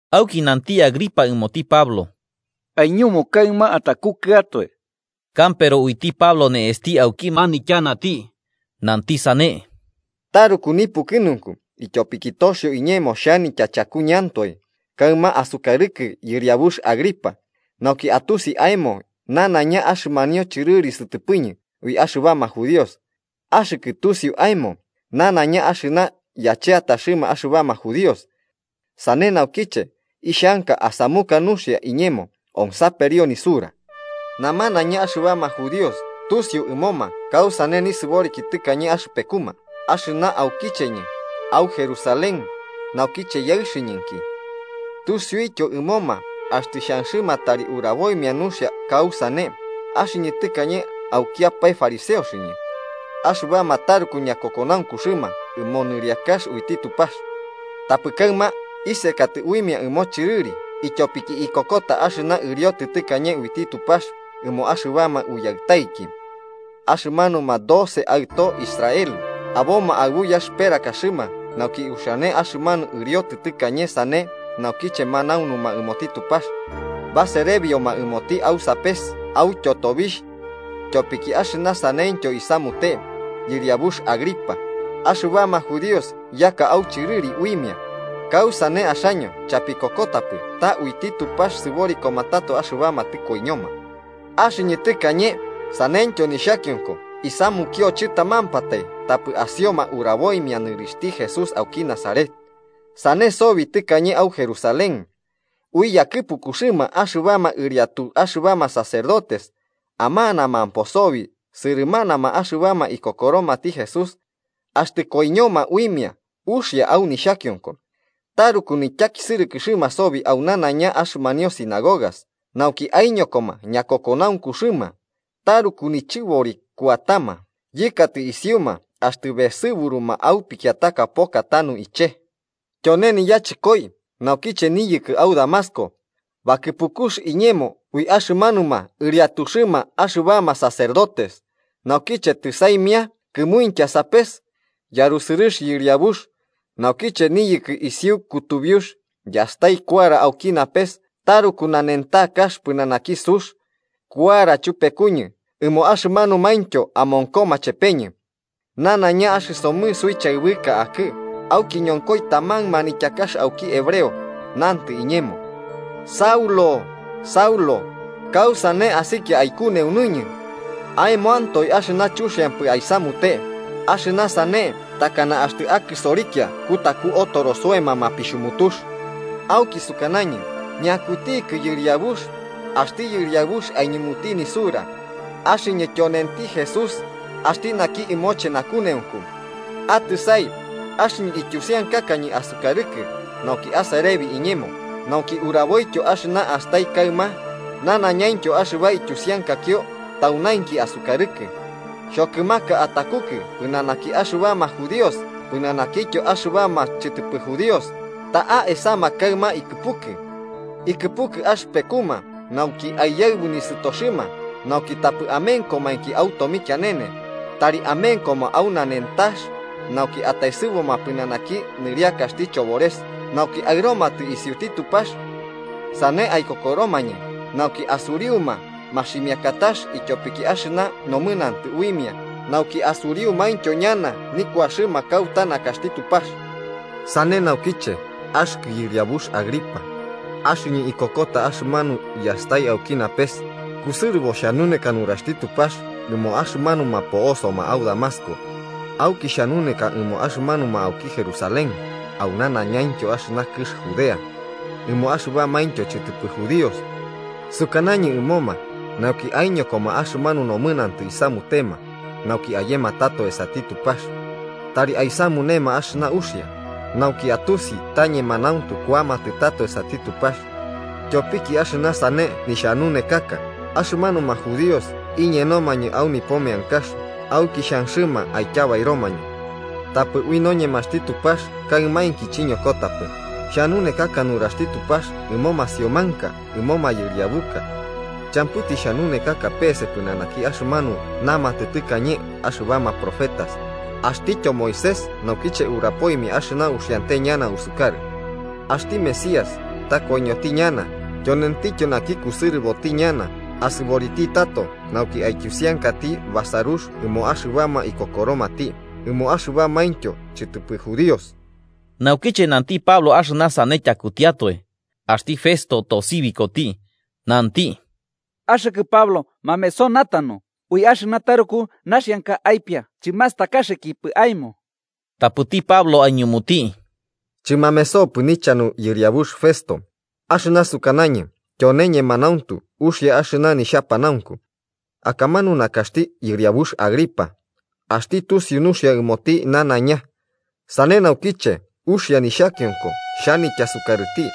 Auki nanti Agripa ɨmoti Pablo: –Aiñumu kaɨma atakukɨatoe. Kampero uiti Pablo ne'esti auki manityanati, nanti sane: “Taruku nipukɨnunku ityopiki toxio iñemo xhanitya chakuñɨantoe kaɨma asukarɨkɨ yɨriabux Agripa, nauki atusi aemo nanaiña axɨmanio chɨrɨri sɨtɨpɨñɨ ui axɨbama judíos. Axɨkɨ tusiu aemo nanaiña axɨna yacheataxɨma axɨbama judíos. Sane naukiche ixhanka asamuka nuxia iñemo onsaperio nisura. “Namanaiña axɨbama judíos tusiu ɨmoma kausane nisɨboriki tɨkañe axɨpekuma, axɨna aukicheñɨ, au Jerusalén, naukiche yaɨxɨñɨnki. Tusiuityo ɨmoma, axtɨ xhanxɨma tari uraboimia nuxia kausane, axɨñɨ tɨkañe aukiapae fariseoñɨ. Axɨbama taruku ñakokonaunkuxɨma ɨmo nɨriakax uiti Tupax. Tapɨ kaɨma isekatɨ uimia ɨmo chɨrɨri ityopiki ikokota axɨna ɨriotɨ tɨkañe uiti Tupax ɨmo axɨbama uyaɨtaiki. Axɨmanuma doce aɨtoxti Israel aboma aɨbu yaxɨperakaxɨma nauki uxiane axɨmanu ɨriotɨ tɨkañe, sane naukiche manaunuma ɨmoti Tupax, baserebioma ɨmoti au sapes autyo tobixh. Tyopiki axɨna saneityo isamute, yɨriabux Agripa, axɨbama judíos yaka au chɨrɨri uimia. ¿Kausane axaño chapikokotapɨ ta uiti Tupax sɨborikoma tato axɨbama tɨkoiñoma? “Axɨñɨ tɨkañe saneityo nixhakionko isamunio chɨtamampatai tapɨ asioma uraboimia nɨrixhti Jesús auki Nazaret. Sane sobi tɨkañe au Jerusalén. Ui yakɨpukuxɨma axɨbama ɨriatu axɨbama sacerdotes, amanamampo sobi sɨrɨmanama axɨbama ikokoromati Jesús. Axtɨ koiñoma uimia uxia au nixhakionko. Taruku nityakisɨrɨkɨxɨma sobi au nanaiña axɨmanio sinagogas nauki aiñokoma ñakokonaunkuxɨma, taruku nichɨbori kuatama yɨkatɨ isiuma axtɨ besɨburuma au pikiataka poka tanu ichee. “Tyone niyachɨkoi naukiche niyɨkɨ au Damasco, bakɨpukux iñemo ui axɨmanuma ɨriatuxɨma axɨbama sacerdotes. Naukiche tɨsaimia kɨmuintya sapes, yarusɨrɨx yɨriabux, naukiche niyɨkɨ isiu kutubiux, yastai kuara auki napes taruku nanentakax pɨnanaki sux, kuara chupekuñɨ ɨmo axɨmanumaintyo amonkoma chepeñɨ. Nanaiña axɨsomɨ suichaɨbɨka akɨ, auki ñonkoi taman manityakax auki hebreo, nantɨ iñemo: ‘Saulo, Saulo, ¿kausane asikia aikuneunuñɨ? Aemoantoe axɨna chuxiampɨ aisamute, axɨna sane takana axtɨ akɨsorikia kutaku otoro soema mapixhumutux.’ Auki sukanañɨ: ‘¿Ñakutikɨ, Yɨriabux?’ Axti Yɨriabux aiñumuti nisura: ‘Axɨñɨ tyonenti Jesús, axti naki ɨmoche nakuneunku. Atɨsai, axɨñɨ ityusiankakañɨ asukarɨkɨ nauki aserebi iñemo, nauki uraboityo axɨna astai kaɨma nanaiñaintyo axɨba ityusiankakio taunainki asukarɨkɨ. Xhokɨmaka atakukɨ pɨnanaki axɨbama judíos pɨnanakityo axɨmanuma chɨtɨpɨ judíos, ta'a esama kaɨma ikɨpukɨ. Ikɨpukɨ axɨpekuma nauki aiyaɨbu nisɨtoxɨma nauki tapɨ amenkomainki au tomikianene, tari amenkoma au nanentax. Nauki ataesɨbuma pɨnanaki nɨriakaxti chobores, nauki aɨromatɨ isiuti Tupax. Sane aikokoromañɨ nauki asuriuma maximiakatax ityopiki axɨna nomɨnantɨ uimia nauki asuriumaintyo ñana nikuaxɨma kauta nakaxti Tupax.’ “Sane naukiche, axɨkɨ yɨriabux Agripa, axɨñɨ ikokota axɨmanu yastai auki napes, kusɨrɨbo xhanuneka nuraxti Tupax ɨmo axɨmanuma po'osoma au Damasco, auki xhanunekaka ɨmoma axɨmanuma auki Jerusalén au nanaiñaintyo axɨmanu kɨx Judea, ɨmo axɨbamaintyo chɨtɨpɨ judíos, sukanañɨ ɨmoma nauki aiñokoma axɨmanu nomɨnantɨ isamutema nauki ayematɨ tato esati Tupax. Tari aisamunema axɨna uxia, nauki atusi, ta ñemanauntu kuamatɨ tato esati Tupax. Tyopiki axɨna sane nixhanunekaka, axɨmanuma judíos iñenomañɨ au nipo meankax auki xhanxɨma aityabairomañɨ. Tapɨ ui noñemaxti Tupax kaɨmainki chiñokotapɨ, xhanunekaka nuraxti Tupax ɨmo masiomanka, ɨmo mayɨriabuka. Champɨ tixhanunekaka peese pɨnanaki axɨmanu namatɨ tɨkañe axɨbama profetas axtityo Moisés naukiche urapoimia axɨna uxiante ñana usukarɨ: axti Mesías ta koiñoti ñana, tyonentityo naki kusɨrɨboti ñana asɨboriti tato nauki aityusiankati basarux ɨmo axɨbama ikokoromati, ɨmo axɨbamaintyo chɨtɨpɨ judíos. Naukiche nanti Pablo axɨna sane tyakutiatoe, axti Festo tosibikoti, nanti: –¡Axɨkɨ Pablo mameso natanu! Ui axɨna taruku naxianka aipia chimastakaxɨkipɨ aemo. Tapɨti Pablo aiñumuti: –Chɨmamesopɨ nichanu, yɨriabux Festo. Axɨna sukanañɨ tyone ñemanauntu, uxia axɨna nixhapanaunku. Akamanu nakaxti yɨriabux Agripa, axti tusiu nuxia ɨmoti nanaiña, sane naukiche uxia nixhakionko xhanitya sukarɨti.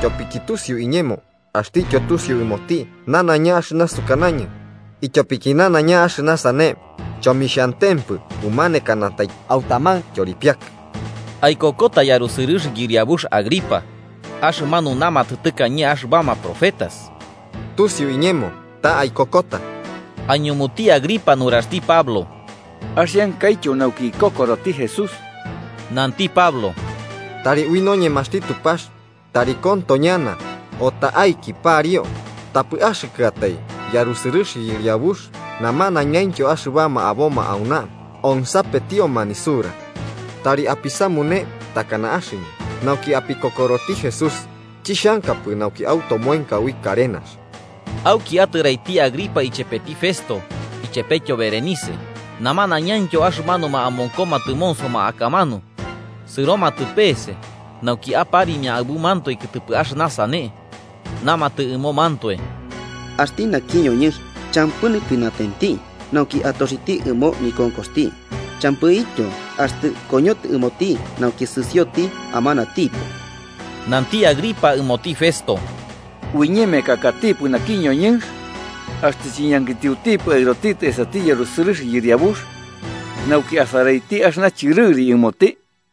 Tyopiki tusiu iñemo, axtityo tusiu ɨmoti nanaiña axɨna sukanañɨ, ityopiki nanaiña axɨna sane chomixhantempɨ umanekanatai au taman tyoripiakɨx. ¿Aikokota yarusɨrɨx yɨriabux Agripa, axɨmanu namatɨ tɨkañe axɨbama profetas? Tusiu iñemo ta aikokota. Aiñumuti Agripa nuraxti Pablo: –Axiankaityo nauki ikokoroti Jesús. Nanti Pablo: –Tari ui ñoñemaxti Tupax tari konto ñana o ta'aiki pariu tapɨ axɨkɨatai yarusɨrɨx yɨriabux namanañaintyo axɨbama aboma auna onsapetioma nisura, tari apisamune takana axɨñɨ nauki apikokoroti Jesús, chixhankapɨ nauki automoenka ui karenax. Auki atɨraiti Agripa ichepeti Festo ichepetyo Berenice, namanañaintyo axɨmanuma amonkoma tɨmonsoma akamanu, sɨromatɨ peese nauki aparimia aɨbumantoe kɨtɨpɨ axɨna sane. Namatɨ ɨmomantoe: –Axti naki ñoñɨnx champɨ nipɨnatenti nauki atoxiti ɨmo nikonkoxti. Champɨityo axtɨ koñotɨ ɨmoti nauki sɨsioti amanatipo. Nanti Agripa ɨmoti Festo: –Uiñemekakatipɨ naki ñoñɨnx, axtɨ chiñankitiotipɨ aɨrotitɨ esati yarusɨrɨx yɨriabux nauki asaraiti axɨna chɨrɨri ɨmoti.